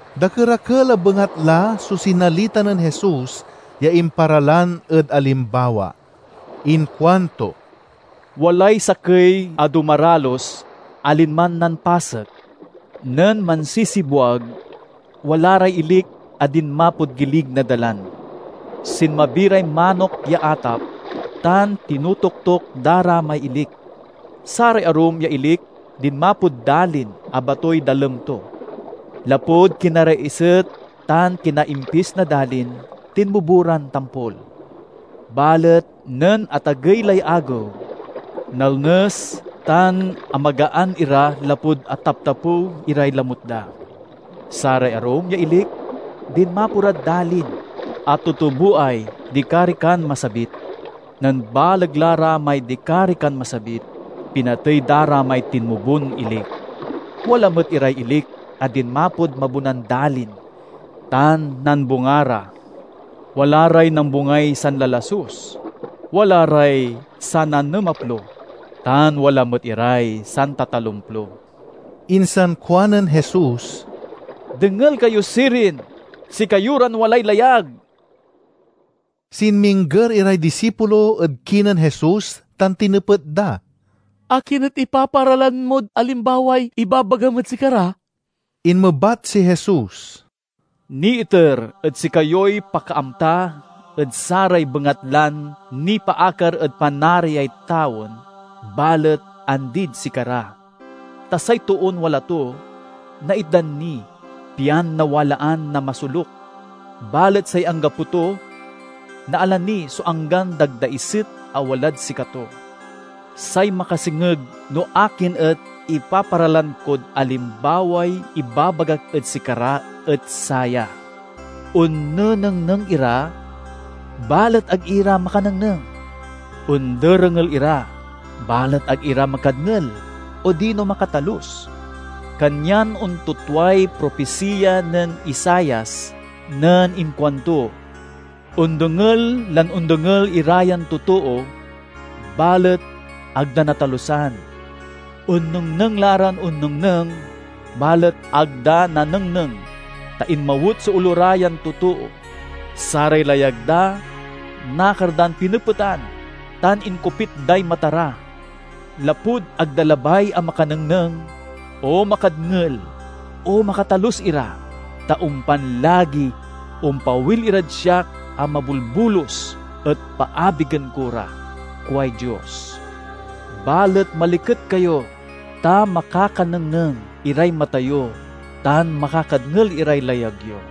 Dakerakel a bengatla so sinalita nen Jesus ya imparalan ed alimbawa. Inkuanto: "Walay sakey a dumaralus a linman nampasek. Nen mansisibwag wala ray ilik a dinmapod gilig na dalan. Sinmabi ray manok ya atap tan tinotoktok da ra may ilik. Saray arum ya ilik dinmapod dalin a batoy dalem to. Lapud kinaraiset tan kinaimpis na dalin, tinmubo ran tampol. Balet nen atagey lay agew, nalnes tan amagaan ira lapud ataptapew iray lamut da. Saray arum ya ilik dinmapo rad dalin a tutuboay dikarikan masabit. Nen baleg la ra may dikarikan masabit, pinatey da ra may tinmubon ilik. Wala met iray ilik a dinmapod mabonan dalin tan nambunga ra. Wala ray nambungay sanlalasus, wala ray sananemaplo, tan wala met iray santatalomplo." Insan kuanen Jesus, "Dengel kayo sirin, sikayo ran walay layag!" Sinmingger iray disipulo ed kinen Jesus tan tinepet da, "Akin et ipaparalan mod alimbaway ibabagam ed sikara?" Inmebat si Jesus, "Niiter ed sikayoy pakaamta ed saray bengatlan nipaakar ed Panariay tawen, balet andid sikara. Ta say toon wala to naitdan ni, pian nawalaan na masoluk; balet say anggapo to, naala ni so anggan dagdaiset a walad sikato. Say makasengeg no akin et ipaparalan kod alimbaway ibabagak ed sikara et saya: onnenengneng ira, balet ag ira makanengneng; onderengel ira, balet ag ira makadngel odino makatalus. Kanyan ontutway propisiya nen Isaias nen inkuanto: 'Ondengel lan ondengel ira yan totoo, balet ag da natalusan; onnengneng la ran onnengneng balet ag da nanengneng, ta inmawet so olo ra yan totoo, saray layag da nakar dan pinepetan, tan inkopit day mata ra. Lapud ag da labay a makanengneng, o makadngel, o makatalus ira, ta ompan lagi ompawil irad siak a mabolbolus, et paabigen ko ra, kuay Dios.' "Balet maliket kayo, ta makakanengneng iray mata yo tan makakadngel iray layag yo.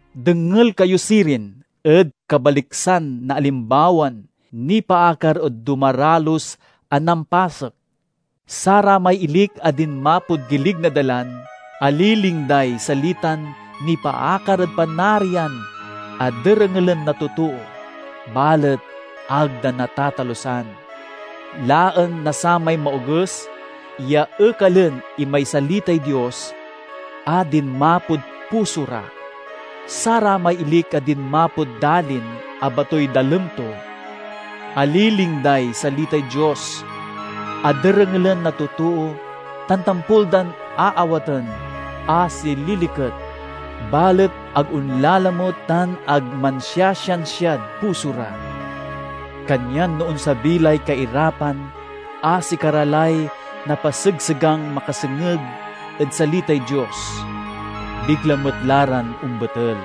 "Dengel kayo sirin ed kabaliksan na alimbawan nipaakar ed dumaralus a nampasek. Saramay ilik a dinmapod gilig na dalan aliling day salitan nipaakar ed Panarian a derengelen na totoo, balet ag da natatalusan. Laen na samay Maoges ya ekalen imay salitay Dios a dinmapod puso ra. Saramay ilik a dinmapod dalin a batoy dalem to aliling day salitay Dios a derengelen na totoo tan tampol dan aawaten a sililiket. Balet ag onlalamut tan ag mansiasiansiad puso ra. Kanyan no onsabi lay kairapan a sikara lay napasegsegang makasengeg ed salitay Dios, bigla met la ran ombetel.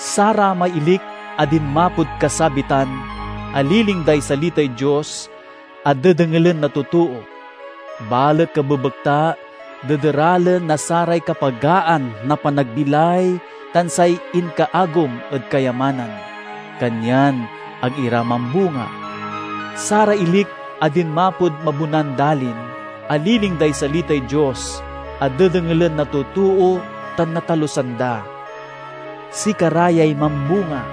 Saramay ilik a dinmapod kasabitan aliling day salitay Dios a dedengelen na totoo, balet kabebekta dederalen na saray kapagaan na panagbilay tan say inkaagum ed kayamanan, kanyan ag ira mambunga. Saray ilik a dinmapod mabonan dalin aliling day salitay Dios a dedengelen na totoo tan natalusan da. Sikara yay mambunga.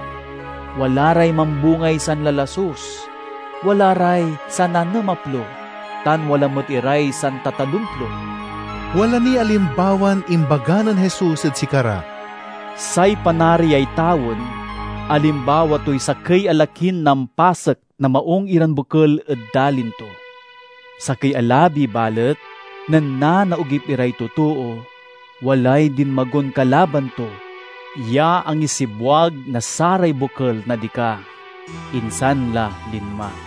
Wala ray mambungay sanlalasus, wala ray sananemaplo, tan wala met iray santatalomplo." Wala niy alimbawan imbaga nen Jesus ed sikara: "Say Panariay tawen alimbawa toy sakey a lakin nampasek na maung iran bokel ed dalin to. Sakey a labi balet, nen nanaogip iray totoo, walay dinmagon kalaban to ya angisibwag na saray bokel na dika; insan la linma.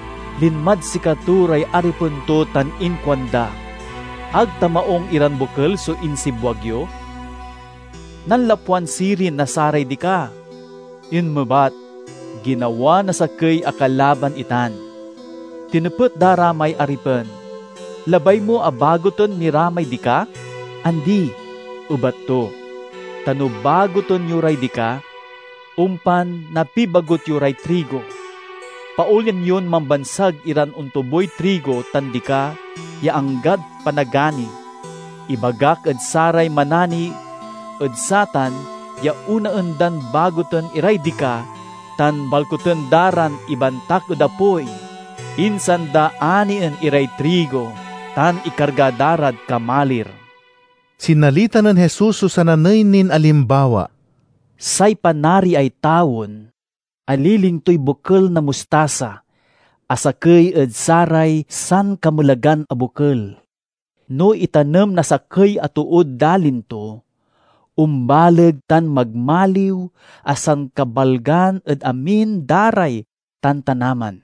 Linmad sikato ray aripen to tan inkuanda, 'Ag ta maung iran bokel so insibwag yo? Nanlapwan sirin na saray dika?' Inmebat, 'Ginawa na sakey a kalaban itan.' Tinepet da ra may aripen, 'Labay mo a baguten mi ra may dika?' 'Andi,' ebat to, 'ta no baguten yo ray dika, ompan napibagut yo ray trigo. Paolyan yon mambansag iran ontuboy trigo tan dika ya anggad panagani. Ibagak ed saray manani ed satan ya onaen dan baguten iray dika tan balkuten da ran ibantak ed apoy, insan da anien iray trigo tan ikarga da rad kamalir.'" Sinalita nen Jesus so sananey nin alimbawa: "Say Panariay tawen aliling toy bokel na mustasa a sakey ed saray sankamelagan a bokel. No itanem na sakey a tood dalin to, ombaleg tan magmaliw a sankabalgan ed amin da ray tantanaman.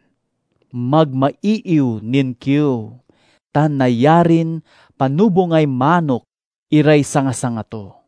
Magmaiiw nin kiew tan nayarin panobungay manok iray sangasanga to."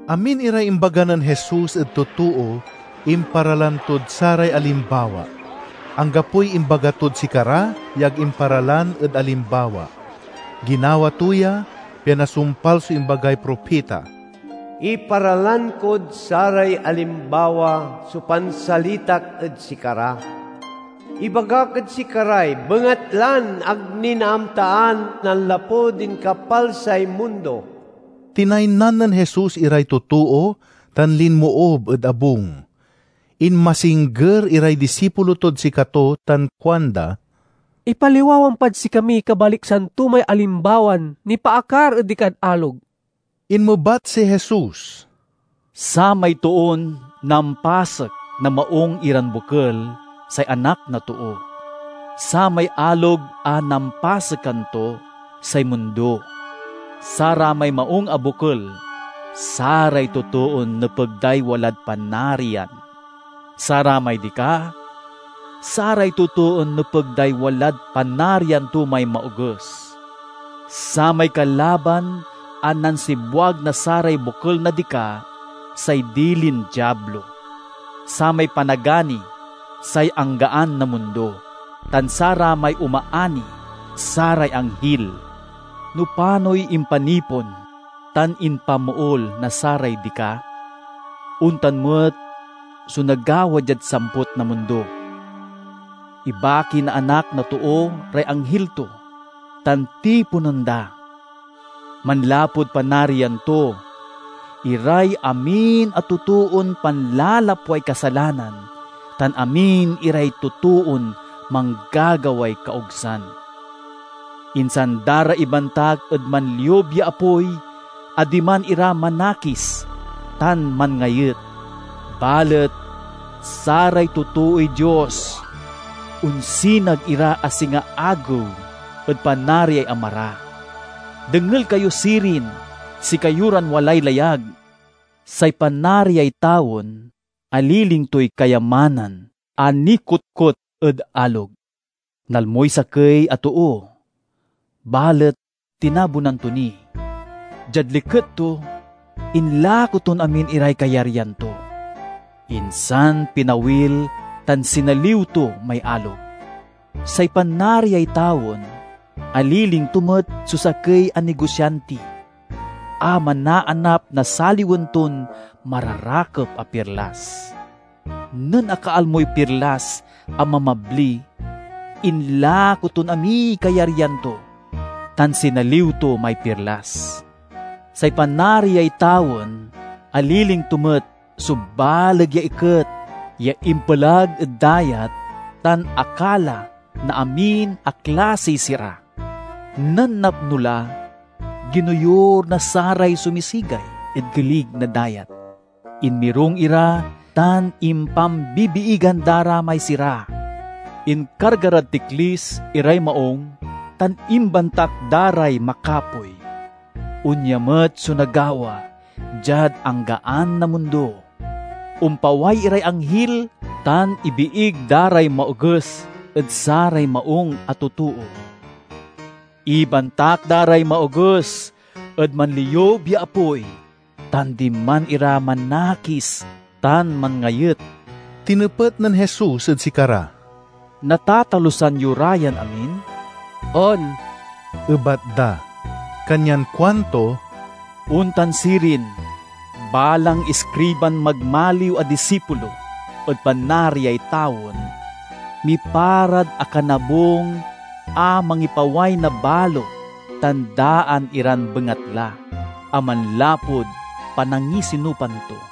Amin iray imbaga nen Jesus ed totoo imparalan tod saray alimbawa. Anggapoy imbaga tod sikara ya ag imparalan ed alimbawa. Ginawa to ya pian nasumpal so imbagay propita: "Iparalan kod saray alimbawa so pansalitak ed sikara; ibagak ed sikaray bengatlan ag ni naamtaan nanlapud inkapalsay mundo." Tinaynan nen Jesus iray totoo tan linmoob ed abung. Inmasingger iray disipulo tod sikato tan kuanda, "Ipaliwawam pad sikamiy kabaliksan to may alimbawan nipaakar ed dikad alog." Inmebat si Jesus, "Samay toon nampasek na maung iran bokel, say Anak na Too; samay alog a nampasekan to, say mundo; saramay maung a bokel, saray totoon nepeg day walad Panarian; saramay dika, saray totoon nepeg day walad Panarian to may Maoges; samay kalaban a nansibwag na saray bokel na dika, say dilin Diablo. Samay panagani, say anggaan na mundo; tan saramay omaani, saray anghil. No panoy impanipon tan impamool na saray dika, ontan met so nagawa diad samput na mundo. Ibaki na Anak na Too ray anghil to tan tiponen da, manlapud Panarian to, iray amin a totoon panlalapway kasalanan tan amin iray totoon manggagaway kaogsan. Insan da ra ibantak ed manliub ya apoy a diman ira manakis tan manngayet. Balet saray totooy Dios onsinag ira a singa agew ed Panariay Ama ra. Dengel kayo sirin, sikayo ran walay layag!" "Say Panariay tawen aliling toy kayamanan a nikotkot ed alog. Nalmoy sakey a too, balet tinabunan to ni. Diad liket to, inlako ton amin iray kayaryan to, insan pinawil tan sinaliw to may alog." "Say Panariay tawen aliling to met so sakey a nogosianti a manaanap na saliwen ton mararakep a pirlas. Nen akalmoy pirlas a mabmabli, inlako ton amiy kayaryan to tan sinaliw to may pirlas." "Say Panariay tawen aliling to met so baleg ya iket ya impelag ed dayat tan akala na amin a klasiy sira. Nen napno la, ginoyur na saray sumisigay ed gilig na dayat. Inmirung ira tan impambibiigan da ra may sira, inkarga rad tiklis iray maung tan imbantak da ray makapoy. Onya met so nagawa diad anggaan na mundo: ompaway iray anghil tan ibiig da ray maoges ed saray maung a totoo. Ibantak da ray maoges ed manliub ya apoy tan diman ira manakis tan manngayet." Tinepet nen Jesus ed sikara, "Natatalusan yo ra yan amin?" "On," ebat da. Kanyan kuanto, "Ontan sirin, balang iskriban magmaliw a disipulo ed Panariay tawen, miparad akanabung a mangipaway na balo tan daan iran bengatla a manlapud panangisinupan to."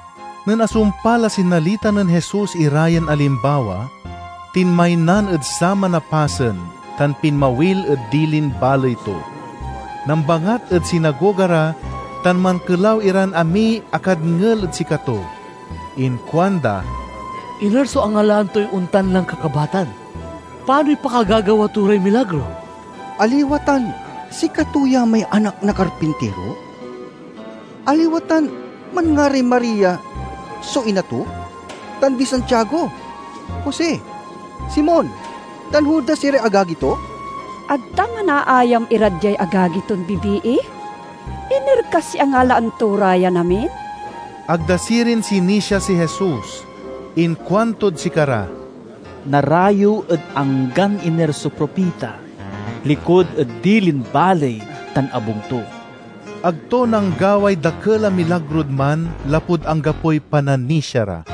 Nen asumpal a sinalita nen Jesus ira yan alimbawa, tinmaynan ed saman a pasen tan pinmawil ed dilin baley to. Nambangat ed sinagoga ra tan mankelaw iran amiy akadngel ed sikato. Inkuanda, "Iner so angalaan toy ontan lan kakabatan? Panoy pakagagawa to ray milagro? Aliwa tan sikato ya may anak na karpintiro? Aliwa tan manngaray Maria so ina to, tan di Santiago, Jose, Simon, tan Judas iray agagi to? Ag ta manaayam ira diay agagi ton bibii? Iner kasiy angalaan to ra yan amin?" Ag da sirin sinisia si Jesus. Inkuantod sikara, "Narayew ed anggan iner so propita, likud ed dilin baley tan abung to." Ag to nanggaway dakel a milagrod man lapud anggapoy pananisia ra.